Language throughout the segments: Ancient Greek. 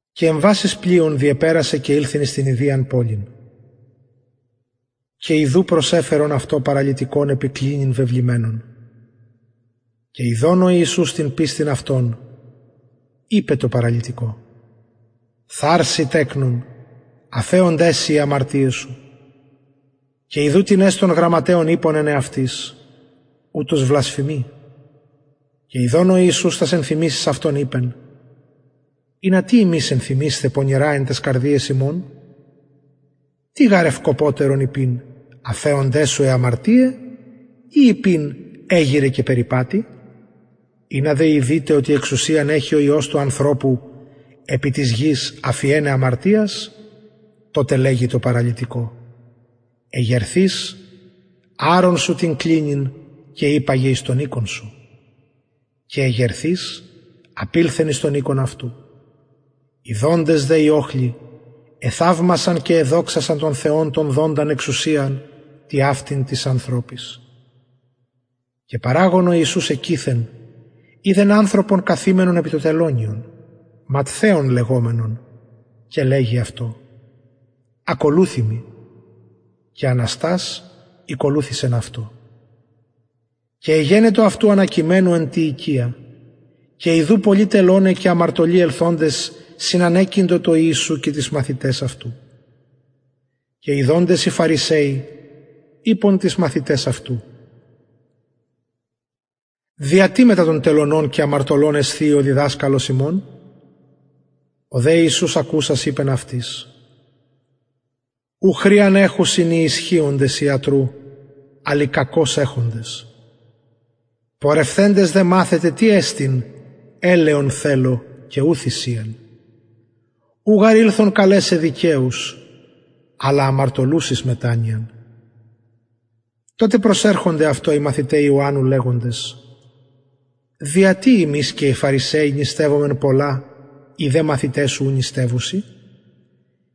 και εμβας εις το πλοιον διεπερασεν και ηλθεν εις την ιδιαν πολιν και ιδου προσεφερον αυτω παραλυτικον επι κλινης βεβλημενον και ιδων ο ιησους την πιστιν αυτων ειπεν τω παραλυτικω θαρσει τεκνον αφεωνται σοι αι αμαρτιαι σου και ιδου τινες των γραμματεων ειπον εν εαυτοις ουτος βλασφημει και ιδων ο ιησους τας ενθυμησεις αυτων ειπεν ινα τι υμεις ενθυμεισθε πονηρα εν ταις καρδιαις υμων τι γαρ εστιν ευκοπωτερον ειπειν αφεωνται σου αι αμαρτιαι η ειπειν εγειραι και περιπατει ινα δε ειδητε οτι εξουσιαν εχει ο υιος του ανθρωπου επι της γης αφιεναι αμαρτιας τοτε λεγει τω παραλυτικω εγερθεις αρον σου την κλινην και υπαγε εις τον οικον σου και εγερθεις απηλθεν εις τον οικον αυτου ιδοντες δε οι οχλοι εθαυμασαν και εδοξασαν τον θεον τον δοντα εξουσιαν τοιαυτην τοις ανθρωποις και παραγων ο ιησους εκειθεν ειδεν ανθρωπον καθημενον επι το τελωνιον ματθαιον λεγομενον και λεγει αυτω ακολουθει μοι και αναστας ηκολουθησεν αυτω και εγενετο αυτου ανακειμενου εν τη οικια και ιδου πολλοι τελωναι και αμαρτωλοι ελθοντες συνανεκειντο τω ιησου και τοις μαθηταις αυτου και ιδοντες οι φαρισαιοι ειπον τοις μαθηταις αυτου δια τι μετα των τελωνων και αμαρτωλων εσθιει ο διδασκαλος υμων ο δε ιησους ακουσας ειπεν αυτοις ου χρειαν εχουσιν οι ισχυοντες ιατρου αλλ οι κακως εχοντες πορευθεντες δε μαθετε τι εστιν ελεον θελω και ου θυσιαν ου γαρ ηλθον καλεσαι δικαιους αλλα αμαρτωλους εις μετανοιαν τοτε προσερχονται αυτω οι μαθηται ιωαννου λεγοντες δια τι ημεις και οι φαρισαιοι νηστευομεν πολλα οι δε μαθηται σου ου νηστευουσιν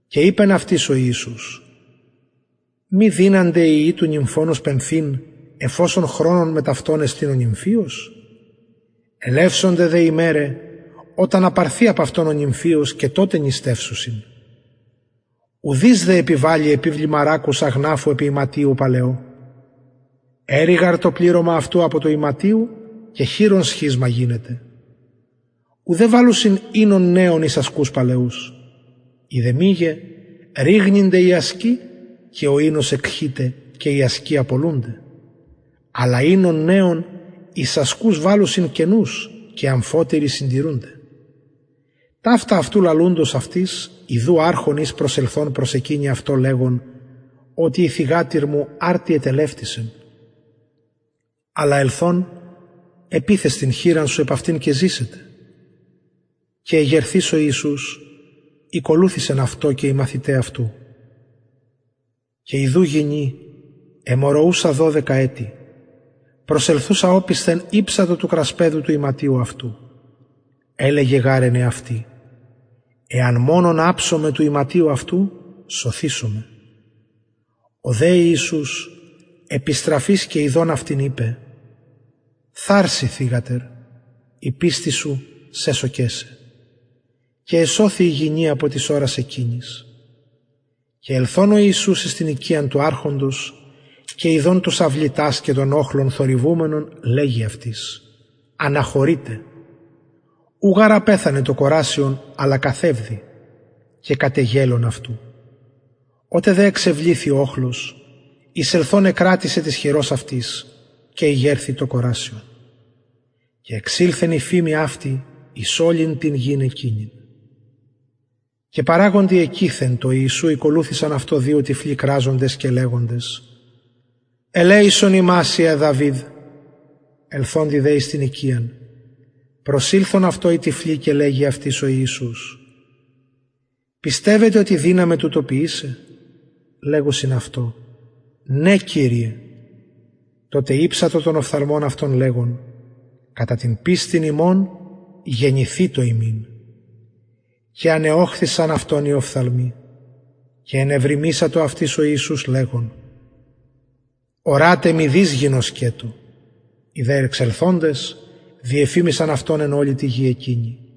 και ειπεν αυτοις ο ιησους μη δυνανται οι υιοι του νυμφωνος πενθειν εφ οσον μετ αυτων εστιν ο νυμφιος ελευσονται δε ημεραι οταν απαρθη απ αυτων ο νυμφιος και τοτε νηστευσουσιν ουδεις δε επιβαλλει επιβλημα ρακους αγναφου επι ιματιω παλαιω αιρει γαρ το πληρωμα αυτου απο του ιματιου και χειρον σχισμα γινεται ουδε βαλλουσιν οινον νεον εις ασκους παλαιους ει δε μηγε ρηγνυνται οι ασκοι και ο οινος εκχειται και οι ασκοι απολουνται αλλα βαλλουσιν οινον νεον εις ασκους καινους και αμφοτεροι συντηρουνται ταυτα αυτου λαλουντος αυτοις ιδου αρχων εις ελθων προσεκυνει αυτω λεγων οτι η θυγατηρ μου αρτι ετελευτησεν αλλα ελθων επιθες την χειρα σου επ αυτην και ζησεται και εγερθεις ο ιησους ηκολουθησεν αυτω και οι μαθηται αυτου και ιδου γυνη αιμορροουσα δωδεκα ετη προσελθουσα οπισθεν ηψατο του κρασπεδου του ιματιου αυτου ελεγεν γαρ εν εαυτη εαν μονον αψωμαι του ιματιου αυτου σωθησομαι ο δε ιησους επιστραφεις και ιδων αυτην ειπεν θαρσει θυγατερ η πιστις σου σεσωκεν σε και εσωθη η γυνη απο της ωρας εκεινης και ελθων ο ιησους εις την οικιαν του αρχοντος και ιδων τους αυλητας και τον οχλον θορυβουμενον λεγει αυτοις αναχωρειτε ου γαρ απεθανεν το κορασιον αλλα καθευδει και κατεγελων αυτου οτε δε εξεβληθη ο οχλος εισελθων εκρατησεν της χειρος αυτης και ηγερθη το κορασιον και εξηλθεν η φημη αυτη εις ολην την γην εκεινην και παραγοντι εκειθεν τω ιησου ηκολουθησαν αυτω δυο τυφλοι κραζοντες και λεγοντες ελεησον ημας υιε δαυιδ ελθοντι δε εις την οικιαν προσηλθον αυτω οι τυφλοι και λεγει αυτοις ο ιησους πιστευετε οτι δυναμαι τουτο ποιησαι λεγουσιν αυτω ναι κυριε τοτε ηψατο των οφθαλμων αυτων λεγων κατα την πιστιν υμων γενηθητω υμιν και ανεωχθησαν αυτων οι οφθαλμοι και ενεβριμησατο αυτοις ο ιησους λεγων ορατε μηδεις γινωσκετω οι δε εξελθοντες διεφημισαν αυτον εν ολη τη γη εκεινη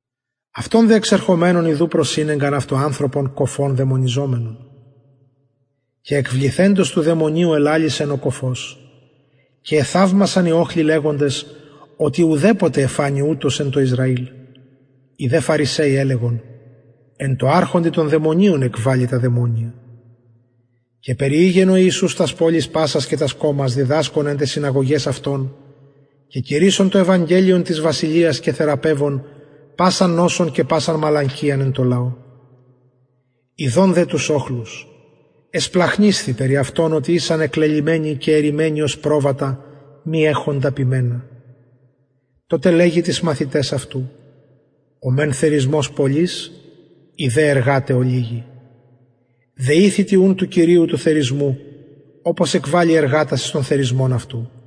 αυτων δε εξερχομενων ιδου προσηνεγκαν αυτω ανθρωπον κωφον δαιμονιζομενον και εκβληθεντος του δαιμονιου ελαλησεν ο κωφος και εθαυμασαν οι οχλοι λεγοντες ουδεποτε εφανη ουτως εν τω ισραηλ οι δε φαρισαιοι ελεγον εν τω αρχοντι των δαιμονιων εκβαλλει τα δαιμονια και περιηγεν ο ιησους τας πολεις πασας και τας κωμας διδασκων εν ταις συναγωγαις αυτων και κηρυσσων το ευαγγελιον της βασιλειας και θεραπευων πασαν νοσον και πασαν μαλακιαν εν τω λαω ιδων δε τους οχλους εσπλαγχνισθη περι αυτων οτι ησαν εσκυλμενοι και ερριμμενοι ωσει προβατα μη εχοντα ποιμενα τοτε λεγει τοις μαθηταις αυτου ο μεν θερισμος πολυς οι δε εργαται ολιγοι δεηθητε ουν του κυριου του θερισμου οπως εκβαλη εργατας εις τον θερισμον αυτου